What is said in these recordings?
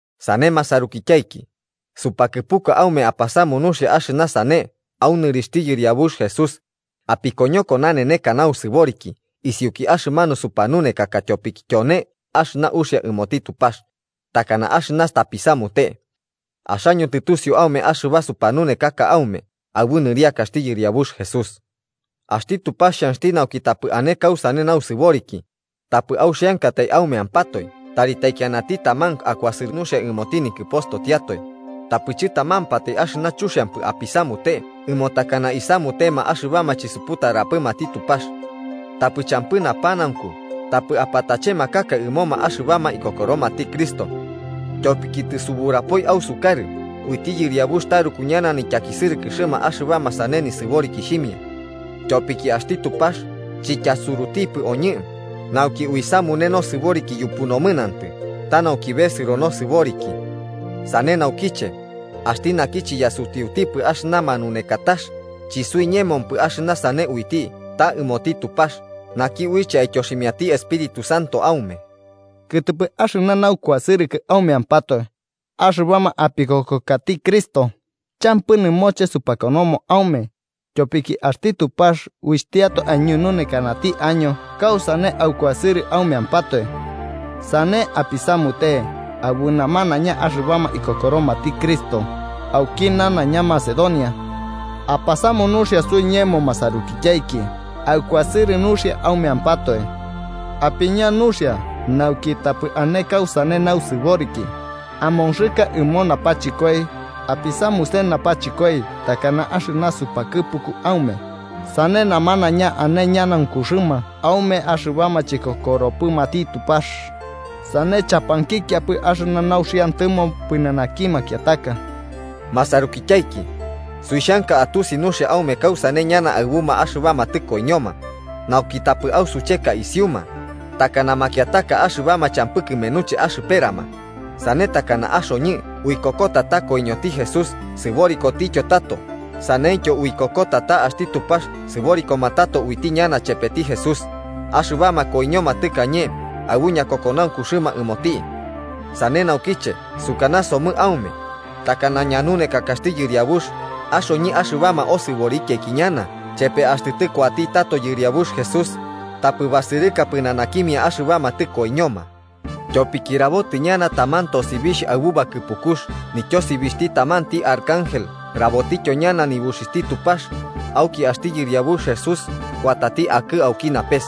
Sane, masarukityaiki, supakɨpuka aume apasamu nuxia axɨna sane au nɨrixhti Yɨriabux Jesús: apikoñoko naneneka nausɨboriki isiuki axɨmanu supanunekaka tyopiki tyone axɨna uxia ɨmoti Tupax, takana axɨna tapisamute. Axaño tɨtusiu aume axɨba supanunekaka aume aɨbu nɨriakaxti Yɨriabux Jesús. Axti Tupax xhanxti nauki tapɨ ane kausane nausɨboriki, tapɨ auxiankatai aumeampatoe tari taikianati taman akuasɨrɨ nuxia ɨmoti nikɨpostotiatoe, tapɨ chɨtamampatai axɨna chuxiampɨ apisamute ɨmo takana isamutema axɨbama chisuputarapɨmati Tupax. Tapɨ champɨ napanaunku tapɨ apatachemakaka ɨmoma axɨbama ikokoromati Cristo. Tyopiki tɨsuburapoi ausukarɨ uiti Yɨriabux taruku ñana nityakisɨrɨkɨxɨma axɨbama sane nisɨborikixhimia. Tyopiki axti Tupax chityasurutipɨ oñɨ nauki uisamune nosɨboriki yupu nomɨnantɨ, ta nauki besɨro nosɨboriki. Sane naukiche, axti naki chiyasutiutipɨ axɨna manunekatax, chisuiñemopɨ axɨna sane uiti ta ɨmoti Tupax, naki uiche aityoximiati Espíritu Santo aume. Kɨtɨpɨ axɨna naukuasɨrɨkɨ aumeampatoe axɨbama apikokokati Cristo, champɨ nɨmoche supakonomo aume, tyopiki axti Tupax uixhtiatoe aiñununekanati año kausane aukuasɨrɨ aumeampatoe. Sane apisamute aɨbu namanaiña axɨmanuma ikokoromati Cristo auki nanaiña Macedonia. Apasamu nuxia suiñemo masarukityaiki aukuasɨrɨ nuxia aumeampatoe. Apiña nuxia nauki tapɨ ane kausane nausɨboriki, amonxɨka ɨmo napachɨkoi, apisamuse napachɨkoi takana axɨna supakɨpuku aume, sane namanaiña ane ñanaunkuxɨma aume axɨbama chikokoropɨmati Tupax, sane chapankikiapɨ axɨna nuxiantɨmo pɨnanaki makiataka. Masarukityaiki, suixhanka atusi nuxia aume kausane ñana aɨbuma axɨbama tɨkoiñoma, nauki tapɨ ausucheka isiuma, takana makiataka axɨbama champɨ kɨmenuche axɨperama. Sane takana axoñɨ uikokota ta koiñoti Jesús sɨborikotityo tato, saneityo uikokota ta axti Tupax sɨborikoma tato uiti ñana chepeti Jesús axɨbama koiñoma tɨkañe aɨbu ñakokonaunkuxɨma ɨmoti. Sane naukiche sukanasomɨ aume, takana ñanunekakaxti Yɨriabux, axoñɨ axɨbama osɨborikiaiki ñana chepe axtɨ tɨkuati tato Yɨriabux Jesús, tapɨ basɨrɨka pɨnanakimia axɨbama tɨkoiñoma. Tyopiki rabotɨ ñana taman tosibixh aɨbu bakɨpukux, nityosibixhti tamanti Arcángel rabotityo ñana nibuxixhti Tupax, auki axti Yɨriabux Jesús kuatati akɨ auki napes.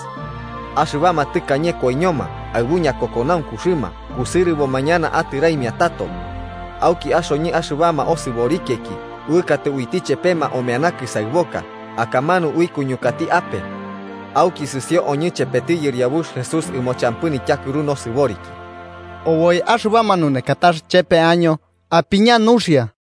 Axɨbama tɨkañe koiñoma aɨbu ñakokonaunkuxɨma kusɨrɨboma ñana atɨraimia tato. Auki axoñɨ axɨbama osɨborikiaiki uɨkatɨ uiti chepema omeana kɨsaɨboka, akamanu uikuñukati ape. Auki sɨsio oñɨ chepeti Yɨriabux Jesús ɨmo champɨ nityakɨru nosɨboriki. Oboi axɨba manunekatax chepe año apiña nuxia.